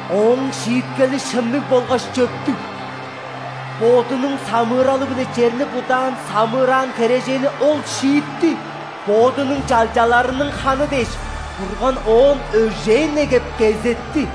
Ооң шииткели шынныг болгаш чөптүг.Бодунуң самыыралы-биле черни будаансамыыраан херээженни Ол шиитти.Бодунуң чалчаларының ханы дээш,Бурган оон өжээн негеп, кезетти!»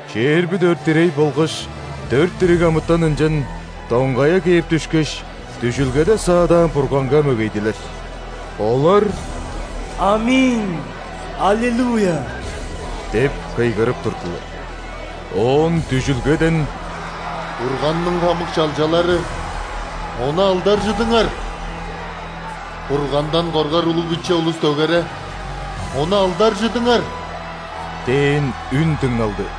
Чээрби дөрт ирей болгаш дөрт дириг амытан ынчан доңгая кээп дүшкеш, дүжүлгеде саадаан Бурганга мөгейдилер. Олар: «·Аминь! Аллилуйя!» – деп кыйгырып турдулар. Оон дүжүлгеден: «Бурганның хамык чалчалары, Ону алдаржыдыңар! Бургандан коргар улуг-биче улус дөгере Ону алдаржыдыңар!» – дээн үн дыңналды.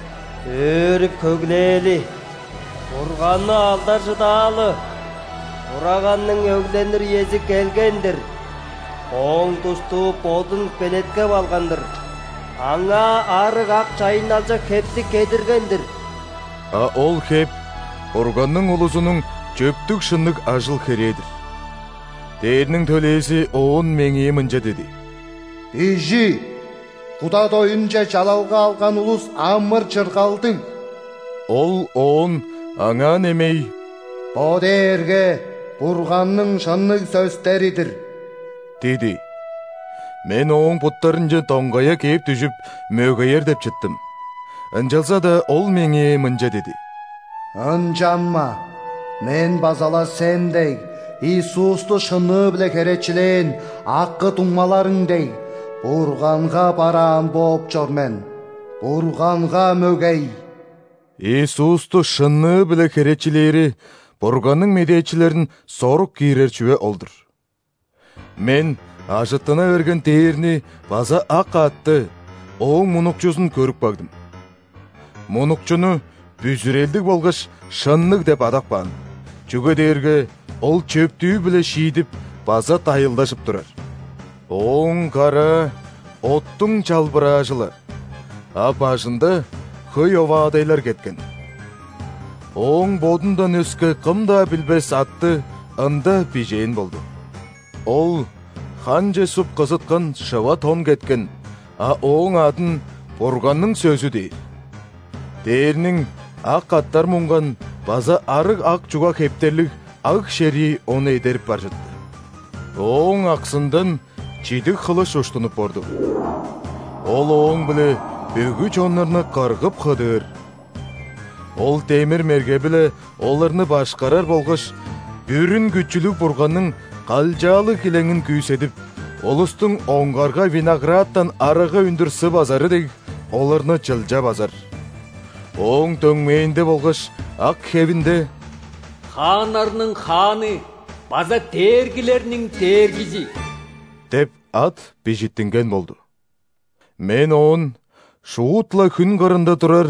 Өөрүп-хөглээли, Бурганны алдаржыдаалы!Хураганның өгленир үези келген-дир.Ооң душтуу бодун белеткеп алган-дыр. Аңаа арыг ак чайынналчак хепти кедирген-дир». (А ол хеп – Бурганның улузунуң чөптүг-шынныг ажыл-херээ-дир.) Дээрниң төлээзи оон меңээ мынча диди: «Бижи: куда доюнче чалалга алган улус амыр-чыргалдыг». Ол оон аңаа немей: «Бо дээрге Бурганның шынныг сөстери-дир» – диди. Мен ооң буттарынче доңгая кээп дүжүп, мөгеер деп чыттым, ынчалза-даа ол меңээ мынча диди: «Ынчанма, мен база-ла, сен дег, Иисусту шынныы-биле херечилээн акы-дуңмаларың дег, Бурганга бараан бооп чор мен. Бурганга мөгей!» (Иисусту шынныы-биле херечилээри – Бурганның медээчилерин сорук киирер чүве ол-дур.) Мен ажыттына берген дээрни база ак аътты, ооң мунукчузун көрүп кагдым. Мунукчуну Бүзүрелдиг болгаш Шынныг деп адап каан, чүге дээрге Ол чөптүү-биле шиидип база дайылдажып турар. Ооң караа – оттуң чалбыраажы-ла, а бажында хөй оваадайлар кеткен. Ооң Бодундан өске кым-даа билбес атты Ында бижээн болду. Ол ханче суп, кызыткан шыва тон кеткен, а Ооң адын «Бурганның Сөзү» дээр. Дээрниң ак аъттар мунган база арыг ак чуга хептерлиг аг-шерии Ону эдерип бар чытты. Ооң аксындан чидиг хылыш уштунуп орду. Ол ооң-биле бүгү чоннарны кыргып-хыдыыр. Ол демир мерге-биле оларны башкарар болгаш Бүрүн Күчүлүг Бурганның калчаалыг килеңин күүседип, улустуң оңгарга виноградтан арага үндүр сы базары дег, оларны чылча базар. Ооң дөңмээнде болгаш ак хевинде: «Хааннарның Хааны база дээргилерниң Дээргизи» деп ат бижиттинген болду. Мен оон шуут-ла хүн кырында турар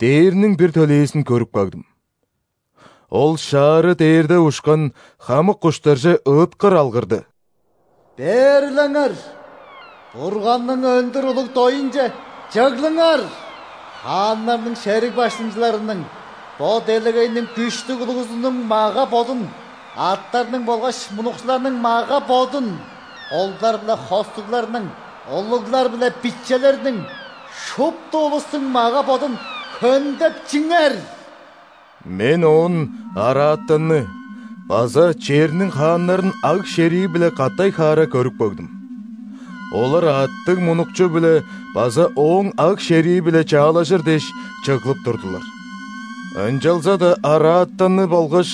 дээрниң бир төлээзин көрүп кагдым. Ол шаары дээрде ушкан хамык куштарже ыыткыр алгырды: «Бээрлеңер! Бурганның өндүр улуг доюнче чыглыңар! Хааннарның, шериг баштыңчыларының, бо делегейниң күштүг улузунуң мага-бодун, аъттарның болгаш мунукчуларның мага-бодун, кулдар биле хостугларның, улуглар биле бичелерниң – шупту улустуң мага-бодун хөндеп чиңер!» Мен оон араатанны база черниң хааннарын аг-шерии-биле катай-хаара көрүп кагдым. Олар аъттыг Мунукчу-биле база Ооң аг-шерии-биле чаалажыр дээш, чыглып турдулар. Ынчалза-даа араатанны болгаш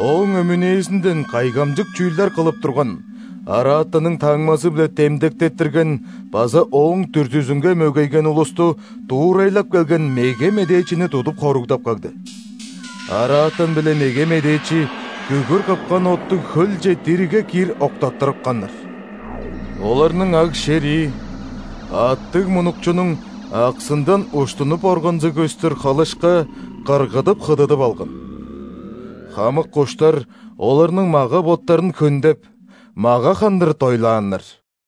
ооң өмүнээзинден кайгамчык чүүлдер кылып турган, араатанның таңмазы-биле демдектеттирген база ооң дүрзүзүнге мөгейген улусту дуурайлап келген меге медээчини тудуп хоругдап кагды. Араатан биле меге медээчи күгүр кыпкан оттуг хөлче диригге киир октаттырыпканнар. Оларның аг-шерии аъттыг Мунукчунуң аксындан уштунуп органзыг көстүр хылышка кыргыдып-хыдыдып алган. Хамык куштар оларның мага-боттарын хөндеп, мага хандыр дойлааннар.